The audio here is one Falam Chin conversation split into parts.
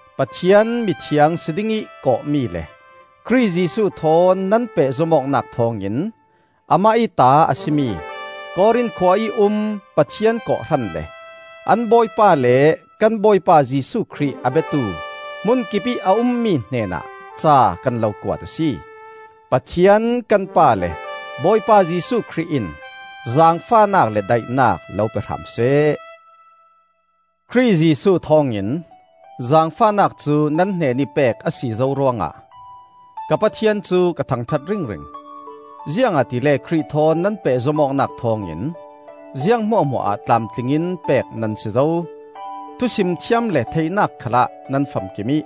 Pathian mithiang si dingih kawhmi le Khrih Jesuh thawn nan pehzom awknak thawngin amah ih ta a si mi, Korin khua ih um Pathian kawhhran le an Bawipa le kan Bawipa Jesuh Khrih a biatu hmunkipih a ummi hnenah ca kan lo kuat a si. Pathian kan Pa le Bawipa Jesuh Khrih in zaangfahnak le daihnak lo pe hram seh. Khrih Jesuh thawngin zaangfahnak cu nan hnenih pek a si zo ruangah ka Pathian cu ka thangṭhat ringring. Ziangahtile Khrih thawn nan pehzom awknak thawngin ziang hmuahhmuah ah tlamtling in pek nan si zo, thusim thiam le theihnak khalah nan famkim ih,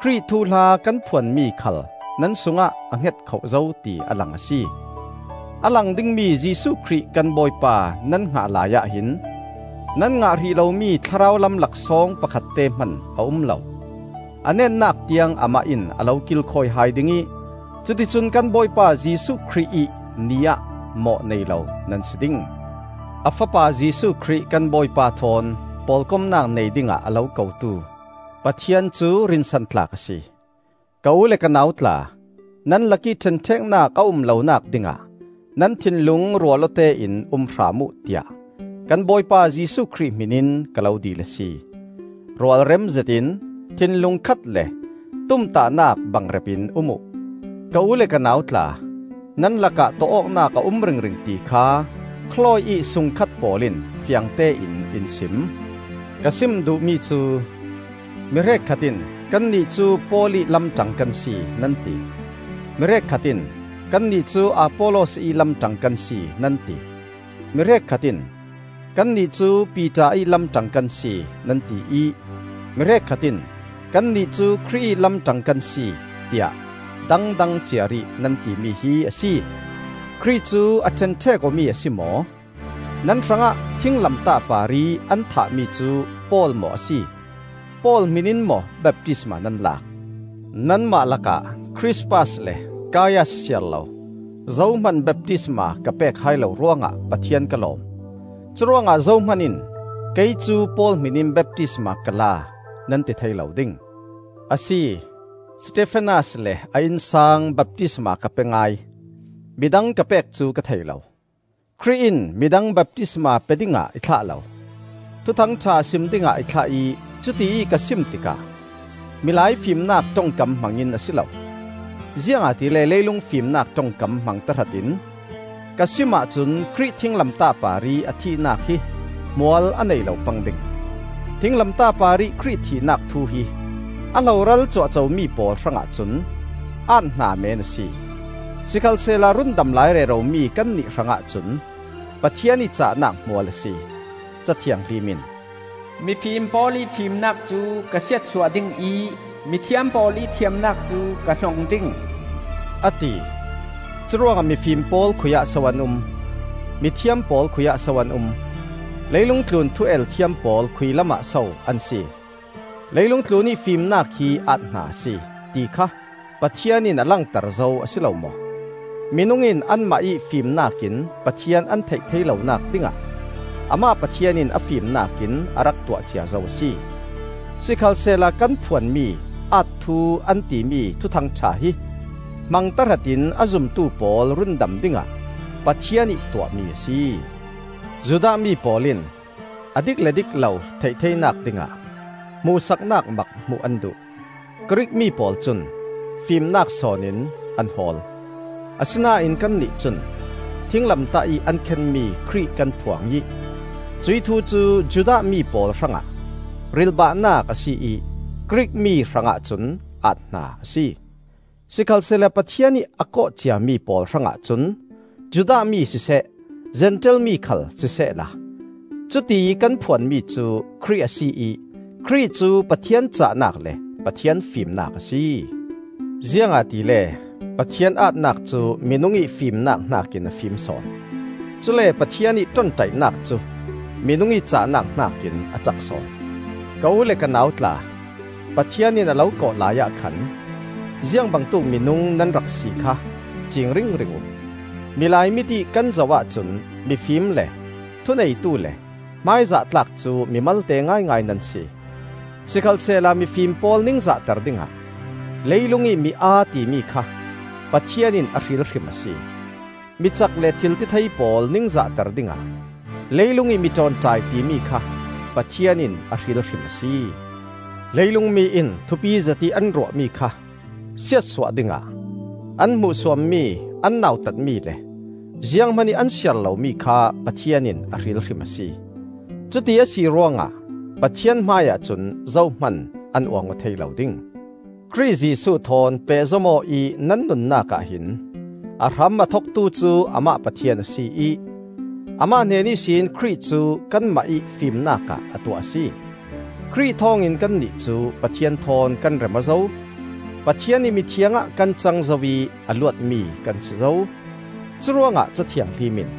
Khrih thuhla kan phuanmi khal nan sungah a hngetkhoh zo ti a lang a si. A lang dingmi Jesuh Khrih kan Bawipa nan hngah laiah hin nan ngah hrih lomi thlarau lam laksawng pakhatte hman a um lo. A netnak tiang Amah in a lo kilkhawi hai ding ih cuticun kan Bawipa Jesuh Khrih ih Ni ah mawh nei lo nan si ding. A Fapa Jesuh Khrih kan Bawipa thawn pawlkomnak nei dingah a lo kotu Pathian cu rinsantlak a si. Ka u le ka nau tla, nan lakih ṭhenṭheknak a um lonak dingah nan thinlung rual awtein um hram uh tiah kan Bawipa Jesuh Khrih hmin in ka lo dil a si. Rualrem zetin, thinlung khat le tumtahnak bangrep in um uh. Ka u le ka nau tla, nan lakah tawh awknak a um ringring ti kha Khlawi ih sungkhat pawl in fiangtein in sim. Ka sim duhmi cu, mi hrekkhat in, “Kannih cu Paul ih lamṭang kan si,” nan ti; mi hrekkhat in, “Kannih cu Apollos ih lamṭang kan si,” nan ti; mi hrekkhat in, “Kannih cu Piter ih lamṭang kan si,” nan ti ih mi hrekkhat in, “Kannih cu Khrih ih lamṭang kan si,” tiah dangdang ciarih nan timi hi a si. Khrih cu a ṭhenṭhek awmi a si maw? Nan hrangah thinglamtah parih an thahmi cu Paul maw a si? Paul hmin in maw baptisma nan lak? Nanmah lakah Khrispas le Kaias siarlo zohman baptisma ka pek hai lo ruangah Pathian ka lawm. Curuangah zohman in, “Kei cu Paul hmin in baptisma ka la,” nan ti thei lo ding. (Asi, Stefanas le a innsang baptisma ka pe ngai; midang ka pek cu ka thei lo.) Khrih in midang baptisma pe dingah i thlah lo, Thuthang ṭha sim dingah i thlah ih cutiih ka sim tikah milai fimnak ṭongkam hmang in a si lo; ziangahtile leilung fimnak ṭongkam hmang tahratin ka sim ahcun Khrih thinglamtah parih a thihnak hi hmual a nei lo pang ding. Thinglamtah parih Khrih thihnak thu hi a hloral cuahcomi pawl hrangah cun aat-hna meen a si; sikhalsehla rundam lai reromi kannih hrangah cun Pathian ih cahnak hmual a si. Ca Thianghlim in, “Mifim pawl ih fimnak cu ka siatsuah ding ih, Mithiam pawl ih thiamnak cu ka hnong ding,” a ti. Curuangah mifim pawl khuiah so an um? Mithiam pawl khuiah so an um? Leilung tlun thu-el thiam pawl khuilamah so an si? Leilung tlunih fimnak hi aat-hna a si, ti kha Pathian in a langter zo a si lo maw? Minung in anmah ih fimnak in Pathian an theih thei lonak dingah amah Pathian in a fimnak in a rak tuah cia zo a si. Sikhalsehla kan phuan mi “aat-thu,” an timi Thuthang ṭha hi hmang tahratin a zumtu pawl rundam dingah Pathian ih tuahmi a si. Judah mi pawl in a dik le dik lo theih theinak dingah hmuhsaknak mak hmuh an duh; Grik mi pawl cun fimnak sawn in an hawl. Asinain kannih cun thinglamtah ih an khenmi Khrih kan phuang ih cuih thu cu Judah mi pawl hrangah rilhbahnak a si ih Grik mi hrangah cun aat-hna a si. Sikhalsehla Pathian ih a kawh ciami pawl hrangah cun Judah mi siseh Zentail mi khal sisehla, cuti kan phuan mi cu Khrih a si ih Khrih cu Pathian cahnak le Pathian fimnak a si. Ziangahtile Pathian aatnak cu minung ih fimnak hnakin a fim sawn; cule Pathian ih ṭonṭaihnak cu minung ih cahnak hnakin a cak sawn. Ka u le ka nau tla, Pathian in a lo kawh laiah khan ziang bangtuk minung nan rak si kha ciing ringring uh. Milai mit ih kan zoh ahcun mifim le thuneitu le hmaizah tlak cu mi malte ngaingai nan si. Sikhalsehla mifim pawl ningzahter dingah leilungih mi-aa timi kha Pathian in a hril hrim a si; micak le thiltithei pawl ningzahter dingah leilungih mi ṭawnṭai timi kha Pathian in a hril hrim a si. Leilung mi in thupizet ih an ruahmi kha siatsuah dingah an hmuhsuammi, an nautatmi le zianghman ih an siar lomi kha Pathian in a hril hrim a si. Cuti a si ruangah Pathian hmaiah cun zohman an uang aw thei lo ding. Khrih Jesuh thawn pehzom aw ih nan nunnak ahhin a hram a thoktu cu Amah Pathian a si ih Amah hnen ihsin Khrih cu kanmah ih fimnak ah a tuah a si. Khrih thawngin kannih cu Pathian thawn kan rem aw zo; Pathian ih mithiang ah kan cang zo ih a luatmi kan si zo. Curuangah Ca Thianghlim in,